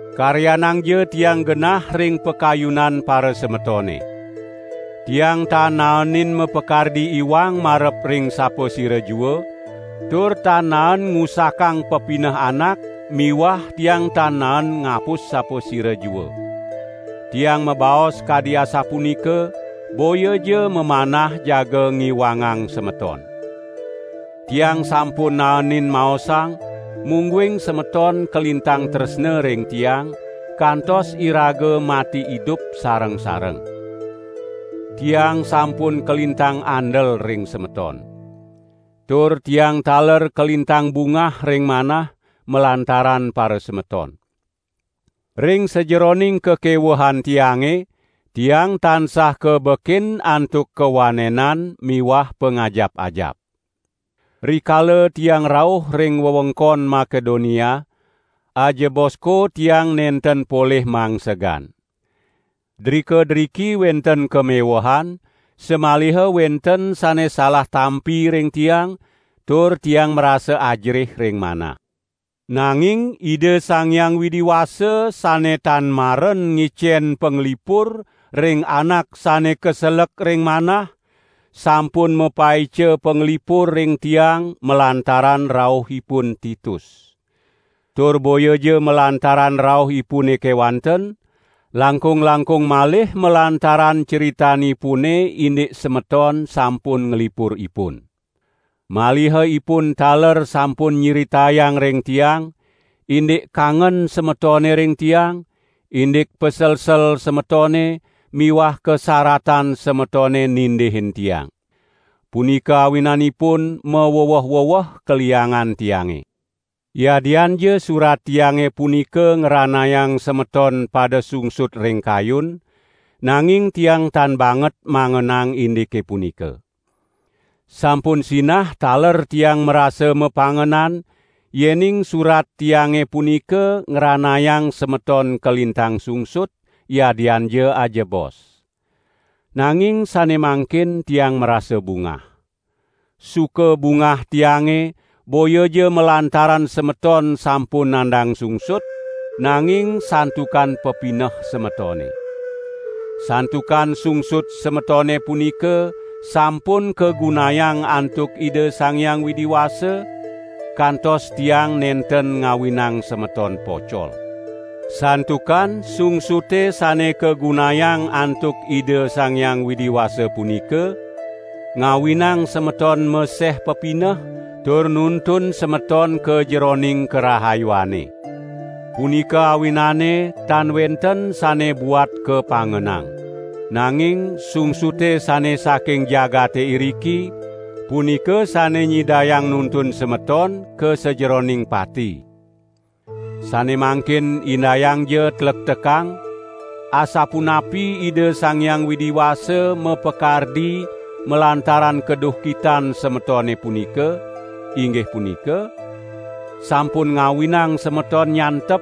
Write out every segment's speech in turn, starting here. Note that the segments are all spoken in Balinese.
Karyanangja tiang genah ring pakayunan parasemetone! Tiang tan naenin mapakardi iwang marep ring sapasira jua, tur tan naen ngusakang pepineh anak miwah tiang tan naen ngapus sapasira jua. Tiang mabaos kadi asapunika boyaja mamanah jaga ngiwangang semeton. Tiang sampun naenin maosang, mungguing semeton kalintang tresna ring tiang, kantos iraga mati idup sareng-sareng. Tiang sampun kalintang andel ring semeton. Tur tiang taler kalintang bungah ring manah malantaran parasemeton. Ring sajeroning kakewehan tiange, tiang tansah kabekin antuk kawanenan miwah pangajap-ajap. Rikala tiang rauh ring wewengkon Makedonia, ajebosko tiang nenten polih mangsegan. Drika-driki wenten kamewehan, samaliha wenten sane salah tampi ring tiang, tur tiang marasa ajerih ring manah. Nanging Ida Sang Hyang Widi Wasa sane tan maren ngicen panglipur ring anak sane kaselek ring manah, sampun mapaica panglipur ring tiang malantaran rauhipun Titus. Tur boyaja malantaran rauhipune kewanten, langkung-langkung malih malantaran critanipune indik semeton sampun nglipur ipun. Maliha ipun taler sampun nyritayang ring tiang, indik kangen semetone ring tiang, indik paselsel semetone miwah kasaratan semetone nindihin tiang. Punika awinanipun maweweh-weweh kaliangan tiange. Yadianja surat tiange punika ngranayang semeton pada sungsut ring kayun, nanging tiang tan banget mangenang indike punika. Sampun sinah taler tiang marasa mapangenan, yening surat tiange punika ngranayang semeton kalintang sungsut, yadianja ajebos. Nanging sane mangkin tiang marasa bungah. Suka bungah tiange boyaja malantaran semeton sampun nandang sungsut, nanging santukan pepineh semetone. Santukan sungsut semetone punika sampun kagunayang antuk Ida Sang Hyang Widi Wasa, kantos tiang nenten ngawinang semeton pocol. Santukan sungsute sane kagunayang antuk Ida Sang Hyang Widi Wasa punika, ngawinang semeton meseh pepineh tur nuntun semeton ka jeroning karahayuane. Punika awinane tan wenten sane buat kapangenang. Nanging sungsute sane saking jagate iriki, punika sane nyidayang nuntun semeton ka sajeroning pati. Sane mangkin indayangja tlektekang, asapunapi Ida Sang Hyang Widi Wasa mapakardi malantaran kaduhkitan semetone punika, inggih punika: sampun ngawinang semeton nyantep,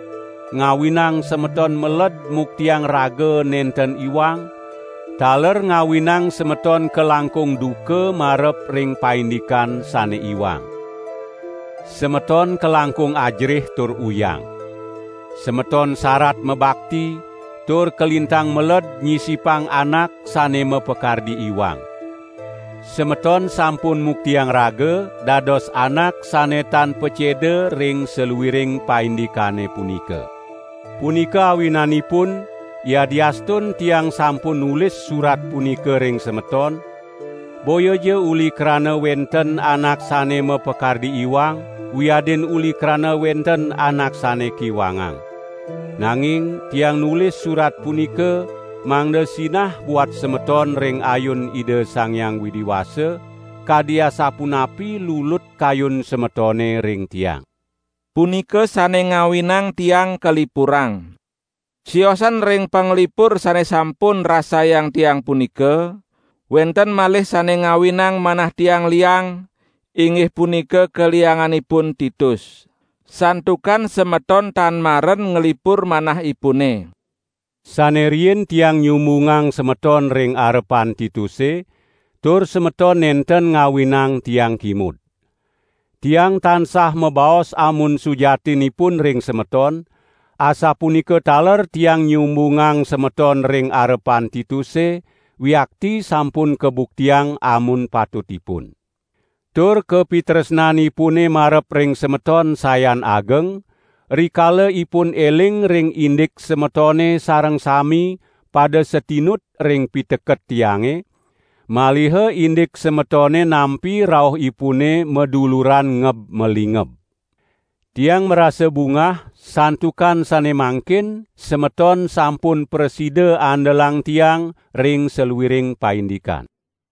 ngawinang semeton meled muktiang raga nenten iwang, taler ngawinang semeton kalangkung duka marep ring paindikan sane iwang. Semeton kalangkung ajerih tur uyang. Semeton sarat mabakti, tur kalintang meled nyisipang anak sane mapakardi iwang. Semeton sampun muktiang raga dados anak sane tan paceda ring saluiring paindikane punika. Punika awinanipun, yadiastun tiang sampun nulis surat punika ring semeton, boyaja uli krana wenten anak sane mapakardi iwang, wiadin uli krana wenten anak sane kiwangang. Nanging tiang nulis surat punika mangda sinah buat semeton ring ayun Ida Sang Hyang Widi Wasa kadi asapunapi lulut kayun semetone ring tiang. Punika sane ngawinang tiang kalipurang. Siosan ring panglipur sane sampun rasayang tiang punika, wenten malih sane ngawinang manah tiange liang, inggih punika kalianganipun Titus. Santukan semeton tan maren nglipur manahipune. Sane riin tiang nyumbungang semeton ring arepan Tituse, tur semeton nenten ngawinang tiang kimud. Tiang tansah mabaos amun sujatinipun ring semeton, asapunika taler tiang nyumbungang semeton ring arepan Tituse wiakti sampun kabuktiang amun patutipun. Tur kapitresnanipune marep ring semeton sayan ageng, rikala ipun eling ring indik semetone sareng sami pada satinut ring piteket tiange, maliha indik semetone nampi rauhipune maduluran ngeb-malingeb. Tiang marasa bungah santukan sane mangkin semeton sampun prasida andelang tiang ring saluiring paindikan.